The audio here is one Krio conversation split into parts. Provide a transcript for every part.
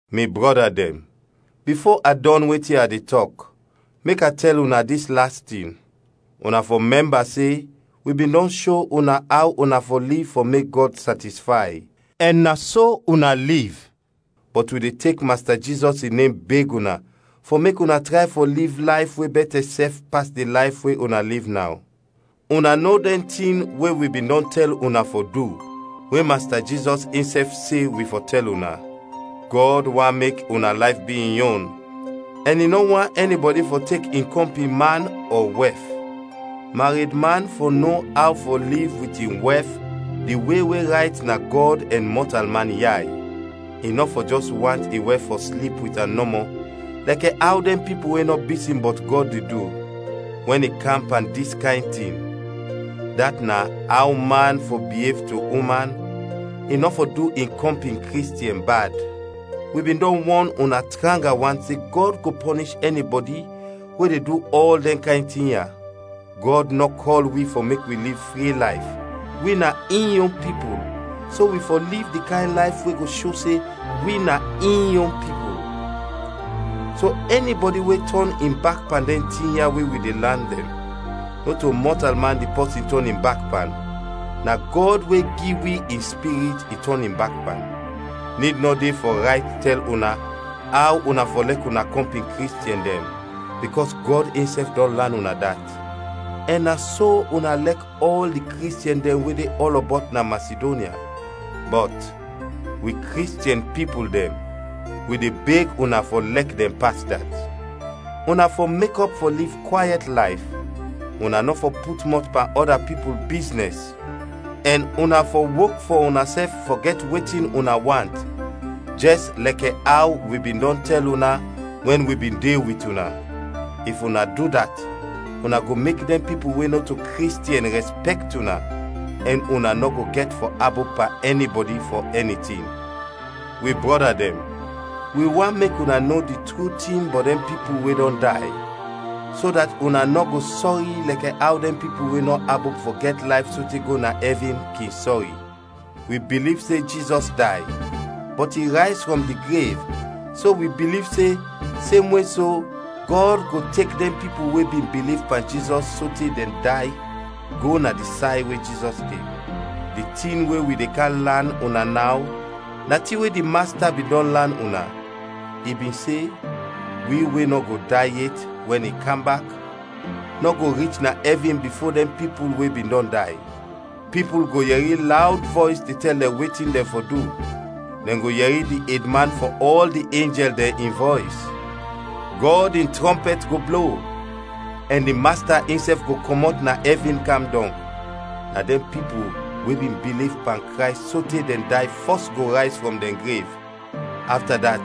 Mi brɔda dɛn, bifo a dɔn wetin a de tɔk, mek a tɛl una dis las tin. Una fɔ mɛmba se wi bin dɔn sho una aw una fɔ liv fɔ mek Gɔd satisfay, ɛn na so una liv, bɔt wi de tek Masta Jizɔs in nem beg una fɔ mek una tray fɔ liv layf we bɛtɛ sɛf pas di layf we una liv naw. Una no dɛn tin we wi bin dɔn tɛl una fɔ du we Masta Jizɔs insɛf se wi fɔ tɛl una. Gɔd want mek una layf bi in yon, ɛn i nɔ want ɛnibɔdi fɔ tek in kɔmpin man ɔ wɛf. Maredman fɔ no aw fɔ liv wit in wɛf di we we rayt na Gɔd ɛn mɔtalman yay; i nɔ fɔ jɛs want in wɛf fɔ slip wit am nɔmɔ, lɛkɛ aw dɛn pipul we nɔ bisin bɔt Gɔd de du. Wɛn i kam pan dis kayn tin, dat na, aw man fɔ biev to uman, i nɔ fɔ du in kɔmpin Kristiɛn bad. Wi bin dɔn wɔn una tranga wan se Gɔd go pɔnish ɛnibɔdi we de du ɔl dɛn kayn tin ya. Gɔd nɔ kɔl wi fɔ mek wi liv fri layf, wi na in yon pipul so wi fɔ liv di kayn layf we go sho se wi na in yon pipul. So ɛnibɔdi we tɔn in bak pan dɛn tin ya we wi de lan dɛn, nɔto mɔtalman di pɔsin tɔn in bak pan, na Gɔd we gi wi in Spirit i tɔn in bak pan. Nid nɔ de fɔ rayt tɛl una aw una fɔ lɛk una kɔmpin Kristiɛn dɛn, bikɔs Gɔd insɛf dɔn lan una dat. Ɛn na so una lɛk ɔl di Kristiɛn dɛn we de ɔlɔbɔt na Masidonya. Bɔt, wi Kristiɛn pipul dɛn, wi de beg una fɔ lɛk dɛn pas dat. Una fɔ mekɔp fɔ liv kwayɛt layf, una nɔ fɔ put mɔt pan ɔda pipul biznɛs, ɛn una fɔ wok fɔ unasɛf fɔ gɛt wetin una want, jɛs lɛkɛ aw wi bin dɔn tɛl una wɛn wi bin de wit una. If una du dat una go mek dɛn pipul we nɔto Kristiɛn rɛspɛkt una, ɛn una nɔ go gɛt fɔ abop pan ɛnibɔdi fɔ ɛni tin. Wi brɔda dɛn, wi want mek una no di tru tin bɔt dɛn pipul we dɔn day, so dat una nɔ go sɔri lɛkɛ aw dɛn pipul we nɔ abop fɔ gɛt layf sote go na ɛvin kin sɔri. Wi biliv se Jizɔs day, bɔt i rayz frɔm di grev, so wi biliv se, semwe so Gɔd go tek dɛn pipul we bin biliv pan Jizɔs sote dɛn day go na di say we Jizɔs de. Di tin we wi de kam lan una naw na tin we di Masta bin dɔn lan una. I bin se, wi we nɔ go day yet wɛn i kam bak, nɔ go rich na ɛvin bifo dɛn pipul we bin dɔn day. Pipul go yɛri lawd vɔys de tɛl dɛn wetin dɛn fɔ du, dɛn go yɛri di edman fɔ ɔl di enjɛl dɛn in vɔys, Gɔd in trɔmpɛt go blo, ɛn di Masta insɛf go kɔmɔt na ɛvin kam dɔng. Na dɛn pipul we bin biliv pan Krays sote dɛn day fɔs go rayz frɔm dɛn grev; afta dat,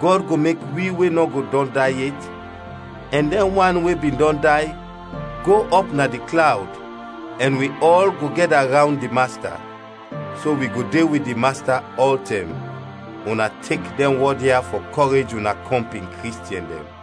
Gɔd go mek wi we nɔ go dɔn day yet ɛn dɛn wan we bin dɔn day, go ɔp na di klawd, ɛn wi ɔl go gɛda rawnd di Masta. So wi go de wit di Masta ɔltɛm. Una tek dɛn wɔd ya fɔ kɔrej una kɔmpin Kristiɛn dɛn.